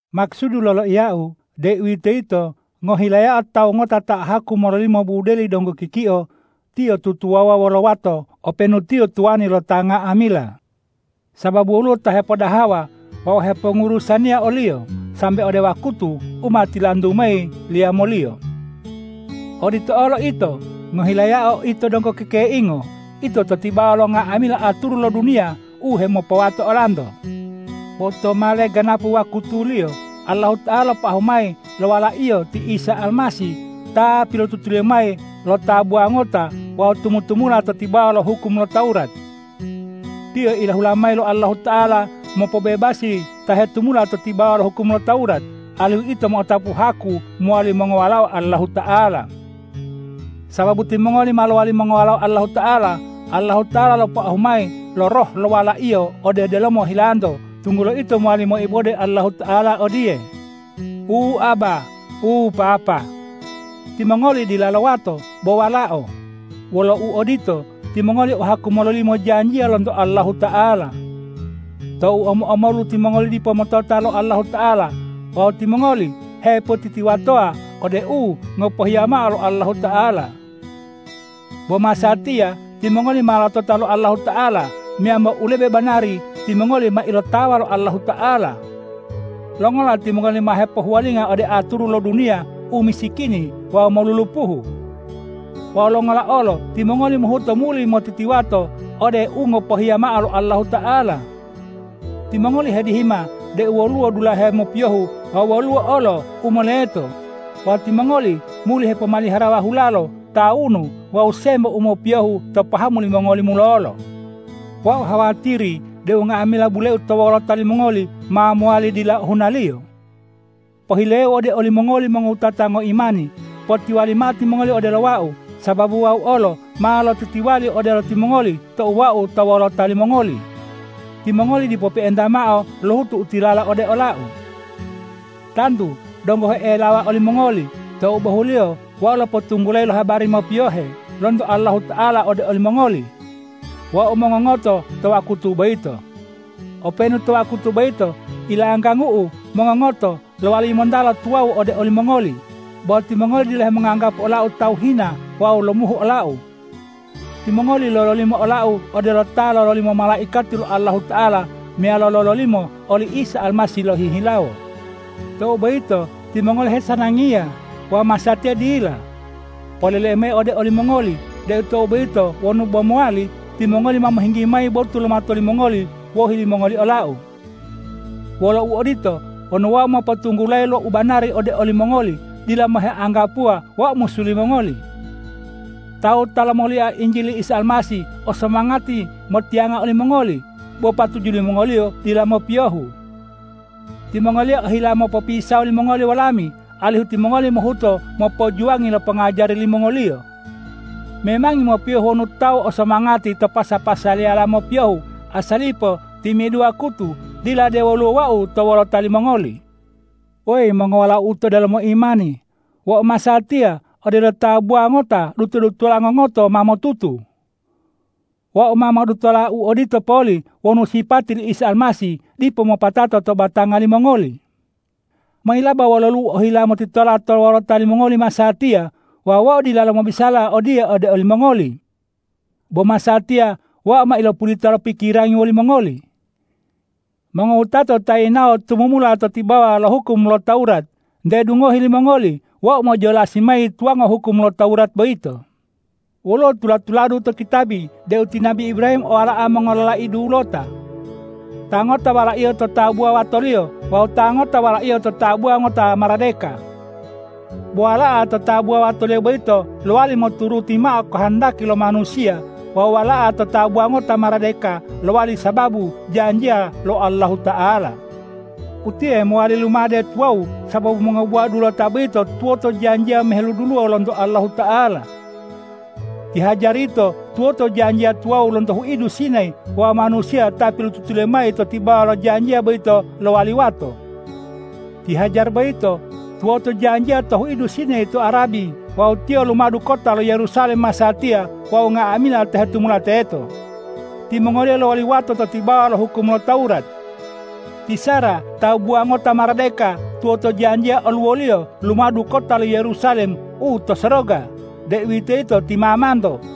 Makusudu loloiyau, deuwitoyito ngohilayao tawu ngota ta o haku mololimo budeli donggo kikio, tiyo tutuwawuwa wolo wato openu tiyo tuwani lo ta nga'amila, sababu woluwo ta hepodahawa wawu hepongurusaniya oliyo sambe ode wakutu u ma tilantu mayi li yamoliyo. Odito olo ito: Ngohilayao ito donggo kekeingo, ito to tibawa lo nga'amila aturu lo duniya u hemopowato olanto. Bo tou ma leganapu wakutuliyo, Allahuta'ala lopoahu mayi lo Wala-Iyo ti Isa Almasih ta pilotutuliyo mayi lo tabuwa ngota wawu tumu-tumula to tibawa lo hukum lo Tawurat. Tiyo ilahula mayi lo Allahuta'ala mopobebasi ta hetumula to tibawa lo hukum lo Tawurat, alihu ito mo'otapu haku mowali mongowalao Allahuta'ala. Sababu timongoli ma lowali mongowalao Allahuta'ala, Allahuta'ala lopoahu mayi lo Roh lo Wala-Iyo ode delomo hilanto, tunggulo ito mowali moibode Allahuta'ala odiye,”Wu Abba! Wu Papa!” Timongoli dilalo wato bo walao. Wolo uodito, timongoli o haku mololimo janjiya lonto Allahuta'ala. Tou omo-omolu timongoli dipo motota lo Allahuta'ala wawu timongoli hepotitiwatowa ode u ngopohiya mao lo Allahuta'ala. Bo masatiya timongoli ma lotota lo Allahuta'ala, meyambo u lebe banari timongoli ma ilotawa lo Allahuta'ala. Longola timongoli ma hepohuwalinga ode aturu lo duniya u misikini wawu molulupuhu? Wawu longola olo timongoli mohuto muli motitiwato ode u ngopohiya mao lo Allahuta'ala? Timongoli hedihima deu woluwo dulahe mopiyohu wawu woluwo olo u moleto wawu timongoli muli hepomaliharawa hulalo, tawunu wawu sembo u mopiyohu to pahamu limongoli mulolo. Wau hawatiri deu nga'amila buleu to wolota limongoli ma mowali dila ohunaliyo. Pohileu ode olimongoli mongowutata ngoimani: Potiwali mao timongoli odelo wau, sababu wau olo ma lotitiwali odelo timongoli tou wau to wolota limongoli. Timongoli dipo pe'enta mao lohutu u tilala ode olau. Tantu donggo he'elawa olimongoli tou bohuliyo wau lopotunggulayi lo habari mopiyohe lonto Allahuta'ala ode olimongoli, wau mongongoto to wakutu boyito. Openu to wakutu boyito ilanggangu'u mongongoto lowali yimontala tuwawu ode olimongoli, bo timongoli dila hemonganggapu olau tawu hina wawu lomuhu olau. Timongoli lololimo olau odelo ta lololimo malaikati lo Allahuta'ala meyalo lololimo oli Isa Almasih lohihilawo. Tou boyito timongoli hesanangiya wawu masatiya dila. Poleleu mayi ode olimongoli deu tou boyito wonu bo mowali, timongoli ma mohinggi mayi botu lo mato limongoli wohi limongoli olau. Wolo uodito, wonu wau mopotunggulayi lo u banari ode olimongoli, dila mao heanggapuwa wau musu limongoli. Tawu ta lomolia Injili li Isa Almasih o somangati motiyanga olimongoli, bo patuju limongoliyo dila mopiyohu. Timongoliyo ohila mopopisawo limongoli wolami, alihu timongoli mohuto mopojuwangi lo pongajari limongoliyo. Memangi mopiyohu wonu tawu o somangati to pasa-pasaliyala mopiyohu, asalipo timi'idu wakutu, dila de woluwo wau to wolota limongoli. Weyi mongowalau'u to delomo imani, wau masatiya odelo tabuwa ngota duto-dutola ngongoto ma motutu. Wau ma modutola u odito poli wonu sipati li Isa Almasih dipo mopatato to batanga limongoli. Mayilaba wololu'u ohila motitola to wolota limongoli masatiya wawu wau dilalo mobisala odiye ode olimongoli. Bo masatiya wau ma ilopulita lo pikirangi wolimongoli. Mongowutato ta yinawo tumumula to tibawa lo hukum lo Tawurat, nte dungohi limongoli wau mojolasi mayi tuwango hukum lo Tawurat boyito. Woluwo tula-tuladu to kitabi deu ti nabi Ibrahim o wala'a mongololai dulota, ta ngota walaiyo to tabuwa watoliyo wawu ta ngota walaiyo to tabuwa ngota maradeka. Bo wala'a to tabuwa watoliyo boyito lowali moturuti mao kohondaki lo manusiya wawu wala'a to tabuwa ngota maradeka lowali sababu janjiya lo Allahuta'ala. Utiye mowali lumade tuwawu sababu mongobuwa dulota boyito tuwoto janjiya moheduluwo lonto Allahuta'ala. Ti Hajar yito tuwoto janjiya tuwawu lonto huidu Sinayi wawu manusiya ta pilotutuliyo mayi to tibawa lo janjiya boyito lowali wato. Ti Hajar boyito tuwoto janjiya to huidu Sinayi to Arabi wawu tiyo lumadu kota lo Yerusalem masatiya wawu nga'amila ta hetumula teto. Timongoliyo lowali wato to tibawa lo hukum lo Tawurat. Ti Sara tabuwa ngota maradeka tuwoto janjiya oluwoliyo lumadu kota lo Yerusalem u to soroga, deuwitoyito ti mamanto.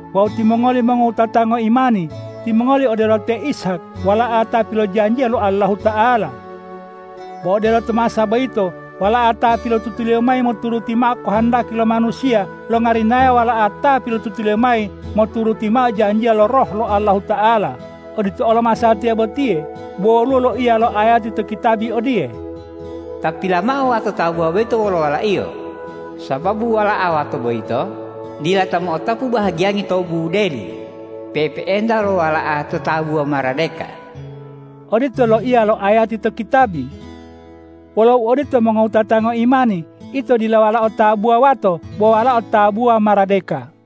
Wawu timongoli mongowutata ngoimani, timongoli odelo te Ishak wala'a ta pilojanjiya lo Allahuta'ala. Bo odelo to masa boyito wala'a ta pilotutuliyo mayi moturuti mao kohondaki lo manusiya longarinaya wala'a ta pilotutuliyo mayi moturuti mao janjiya lo Roh lo Allahuta'ala, odito olo masatiya botiye. Bo woluwo loiya lo ayati to kitabi odiye,”Tapila mao wato tabuwa boyito wolo walaiyo sababu wala'a wato boyito dila ta mo'otapu bahagiyangi to budeli pe'epe'enta wolo wala'a to tabuwa maradeka.” Odito loiya lo ayati to kitabi. Wolo uodito mongowutata ngoimani, ito dila walao tabuwa wato bo walao tabuwa maradeka.